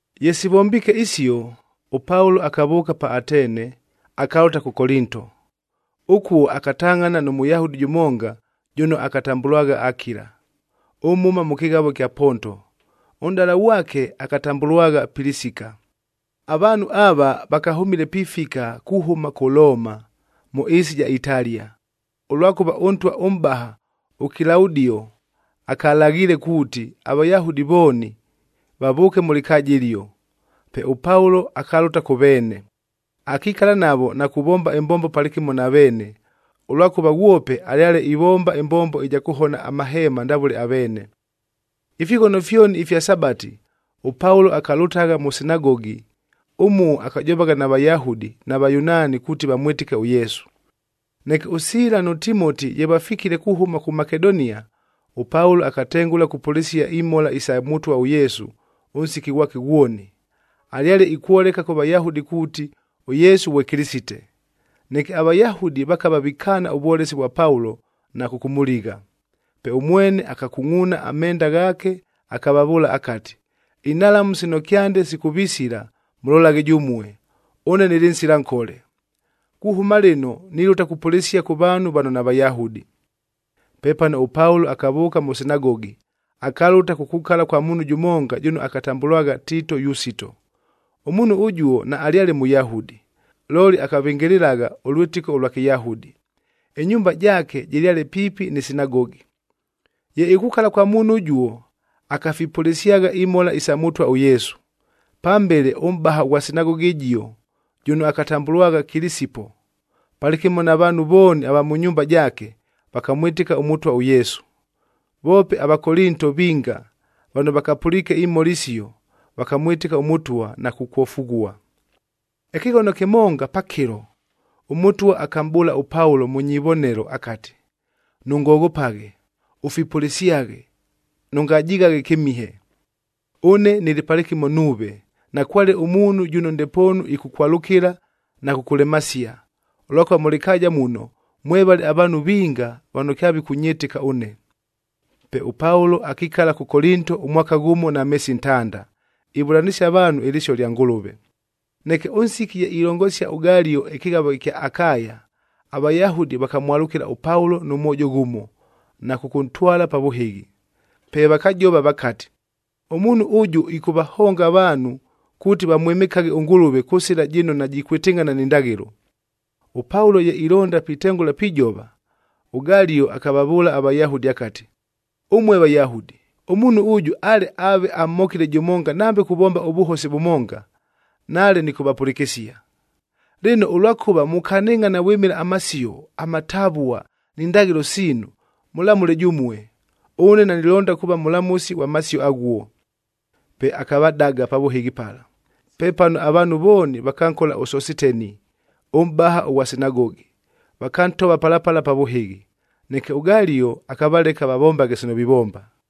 Ye sivombiike isio, ʉPaulo akavʉʉka pa Atene, akalʉta kʉ Kolinto. Ʉkuo akatangʼhana nʉ Mʉyahudi jʉmonga jʉno akatambʉlwagha Akila, ʉmhʉma mʉ kɨghavo ɨkya Ponto, ʉnʼdala ghwake akatambʉlwagha Pilisika. Avaanhu ava, vakahʉmile pifika kuhʉma kʉ Looma, mʉ ɨɨsi ɨja Italia, ʉlwakʉva ʉntwa ʉmʼbaha ʉKilaudioa akalaghiile kuuti aVayahudi vooni, vavʉʉke mʉ lɨkaaja ɨlio. Pe ʉPaulo akalʉta kʉ veene, akikala navo na kuvomba ɨmbombo palɨkɨmo na veene, ʉlwakʉva ghwope alyale ivomba ɨmbombo ɨja kʉhona amahema ndavʉle aveene. Ifighono fyoni ifya Sabati, ʉPaulo akalʉtagha mʉ sinagogi, ʉmuo akajovagha na Vayahudi na Vayunaani kuuti vamwɨtɨke ʉYesu. Neke ʉSiila nʉ Timoti ye vafikile kuhʉma kʉ Makedonia, ʉPaulo akatengʉla kupʉlɨsia imhola isa Mʉtwa ʉYesu ʉnsiki ghwake ghwoni. Alyale ikwoleka kʉ Vayahudi kuuti ʉYesu ghwe Kɨlɨsite. Neke aVayahudi vakava vikaana ʉvwolesi vwa Paulo na kʉkʉmʉligha. Pe ʉmwene akakungʼuuna amenda ghaake,b akavavʉʉla akati, “Inhalamu sino kyande sikʉvisila mʉlolaghe jʉmue, ʉne nɨlɨ nsila nkole. Kuhʉma lɨno, nilʉta kupʉlɨsia kʉ vaanhu vano naVayahudi.” Pepano ʉPaulo akavʉʉka mʉ sinagogi, akalʉta kukukala kwa muunhu jʉmonga jʉno akatambʉlwagha Tiito Yusito. Ʉmuunhu ʉjuo naalyale Mʉyahudi, looli akavɨngɨlɨlagha ʉlwɨtɨko ʉlwa Kɨyahudi, ɨnyumba jaake jɨlyale piipi nɨ sinagogi. Ye ikukala kwa muunhu ʉjuo, akafipʉlɨsyagha imhola isa Mʉtwa ʉYesu. Pambele ʉmʼbaha ʉghwa sinagogi ɨjio, jʉno akatambʉlwagha Kilisipo, palɨkɨmo na vaanhu vooni ava mʉ nyumba jaake, vakamwɨtɨka ʉMʉtwa ʉYesu. Voope aVakolinto vinga vano vakapʉliike imhola isio,c vakamwɨtɨka ʉMʉtwa na kukwofughua. Ɨkɨghono kɨmonga pakɨlo, ʉMʉtwa akamʼbʉʉla ʉPaulo mʉ nyivonelo akati, “Nʉngoghopaghe, ʉfipʉlɨsyaghe, nʉngajighaghe kɨmihe. Ʉne nɨlɨ palɨkɨmo nuuve, nakwale ʉmuunhu jʉno ndepoonu ɨkʉkwalʉkɨla na kʉkʉlemasia, ʉlwakʉva mʉ lɨkaaja muno, mwevale avaanhu vinga vano kyavikʉnyɨtɨka ʉne.” Pe ʉPaulo akikala kʉ Kolinto ʉmwaka ghʉmo na meesi ntanda, ivʉlanɨsia avaanhu ɨlɨsio lya Ngʉlʉve. Neke ʉnsiki ye ilongosia ʉGalio ɨkɨghavo ɨkya Akaya,d aVayahudi vakamwalʉkɨla ʉPaulo nʉ mwojo ghʉmo, na kʉkʉntwala pa vʉhɨghi. Pe vakajova vakati, “Ʉmuunhu ʉjʉ ɨkʉvahonga avaanhu kuuti vamwɨmɨkaghe ʉNgʉlʉve kʉ sɨla jɨno najikwɨtɨngʼhana ni ndaghɨlo.” ɄPaulo ye ilonda pitengʉla pijova, ʉGalio akavavʉʉla aVayahudi akati, “Ʉmue Vayahudi! Ʉmuunhu ʉjʉ ale aave amhokile jʉmonga nambe kuvomba ʉvʉhosi vʉmonga, nale nɨkʉvapʉlɨkɨsia. Lɨno, ʉlwakʉva mukanɨngʼhana vwɨmɨla amasio, amatavua, ni ndaghɨlo siinu, mʉlamʉle jʉmue. Ʉne nanilonda kuuva mʉlamʉsi ghwa masio aghuo.” Pe akavadaga pa vʉhɨghi pala. Pepano avaanhu vooni vakankola ʉSositeni,e ʉmʼbaha ʉghwa sinagogi, vakantova pala pala pa vʉhɨghi. Neke ʉGalio akavaleka vavombaghe sino vivomba.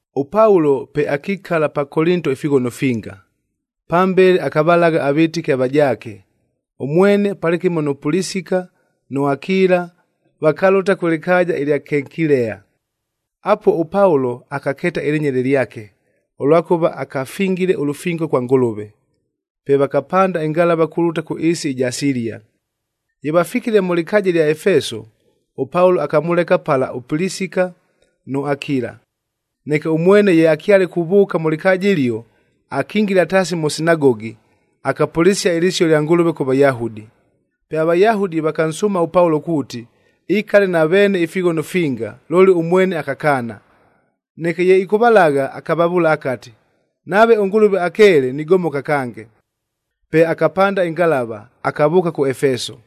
ɄPaulo pe akikala pa Kolinto ifighono finga. Pambele akavalagha avɨtɨki avajaake, ʉmwene palɨkɨmo nʉ Pilisika nʉ Akila vakalʉta kʉ lɨkaaja ɨlya Kenkilea. Apuo ʉPaulo akakeeta ɨlɨnyele lyake,f ʉlwakʉva akafingile ʉlʉfingo kwa Ngʉlʉve. Pe vakapanda ɨngalava kulʉta kʉ ɨɨsi ɨja Silia. Ye vafikile mʉ lɨkaaja ɨlya Efeso, ʉPaulo akamʉleka pala ʉPilisika nʉ Akila. Neke ʉmwene ye akyale kuvʉʉka mʉ lɨkaaja ɨlio, akingila taasi mʉ sinagogi, akapʉlɨsia ɨlɨsio lya Ngʉlʉve kʉ Vayahudi. Pe aVayahudi vakansʉʉma ʉPaulo kuuti, ikale na veene ifighono finga, looli ʉmwene akakaana. Neke ye ɨkʉvalagha, akavavʉʉla akati, “Nave ʉNgʉlʉve akeele, nigomoka kange.” Pe akapanda ɨngalava, akavʉʉka kʉ Efeso.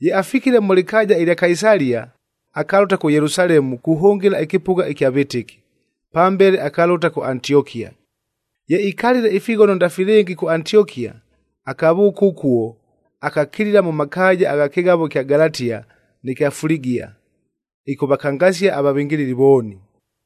Ye afikile mʉ lɨkaaja ɨlya Kaisalia, akalʉta kʉ Yelusalemu kuhʉngɨla ɨkɨpʉgha ɨkya vɨtɨki. Pambele akalʉta kʉ Antiokia. Ye ikalile ifighono ndafilɨngi kʉ Antiokia, akavʉʉka ʉkuo, akakilila mʉ makaaja agha kɨghavo ɨkya Galatia nɨ kya Fuligia, ɨkʉvakangasia avavɨngɨlɨli vooni.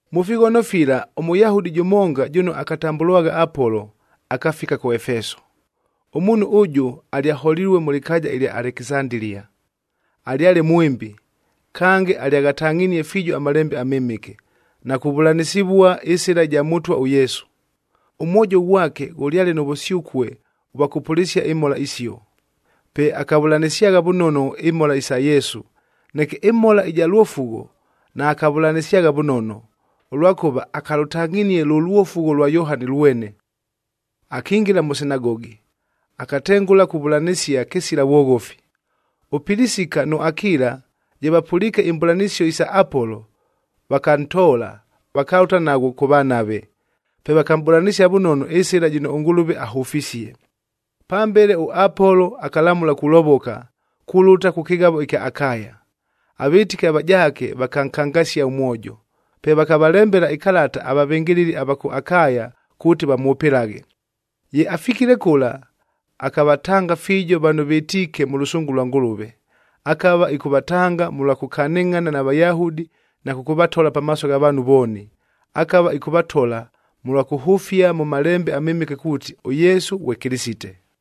Mʉ fighono fila ʉMʉyahudi jʉmonga, jʉno akatambʉlwagha Apolo, akafika kʉ Efeso. Ʉmuunhu ʉjʉ alyaholilue mʉ lɨkaaja ɨlya Alekisandilia, alyale mwɨmbi, kange alyaghatangʼhinie fiijo aMalembe aMɨmɨke, na kuvʉlanɨsɨvua ɨSɨla ɨja Mʉtwa ʉYesu.g Ʉmwojo ghwake ghʉlyale nʉ vʉsyʉkue ʉvwa kʉpʉlɨsia imhola isio, pe akavʉlanɨsyagha vʉnono imhola isa Yesu, neke ɨmhola ɨja lwofugho, naakavʉlanɨsyagha vʉnono, ʉlwakʉva akalʉtangʼhinie lʉ lwofugho lwa Yohani lwene. Akingila mʉ sinagogi, akatengʉla kuvʉlanɨsia kɨsila vwoghofi. ɄPilisika nʉ Akila ye vapʉliike imbʉlanɨsio isa Apolo, vakantoola, vakalʉta naghwo kʉvanave, pe vakamʼbʉlanɨsia vʉnono ɨsɨla jɨno ʉNgʉlʉve ahʉfisie. Pambele ʉApolo akalamʉla kulovoka, kulʉta kʉ kɨghavo ɨkya Akaya. Avɨtɨki avajaake vakankangasia ʉmwojo. Pe vakavalembela ɨkalata avavɨngɨlɨli ava kʉ Akaya kuuti vamwʉpɨlaghe. Ye afikile kʉla, akavatanga fiijo vano vɨtiike mʉ lʉsʉngʉ lwa Ngʉlʉve. Akava ɨkʉvatanga mʉlwa kʉkanɨngʼhana na Vayahudi na kʉkʉvatola pamaaso gha vaanhu vooni. Akava ɨkʉvatola mʉlwa kʉhʉfia mʉ Malembe aMɨmɨke kuuti, ʉYesu ghwe Kɨlɨsite.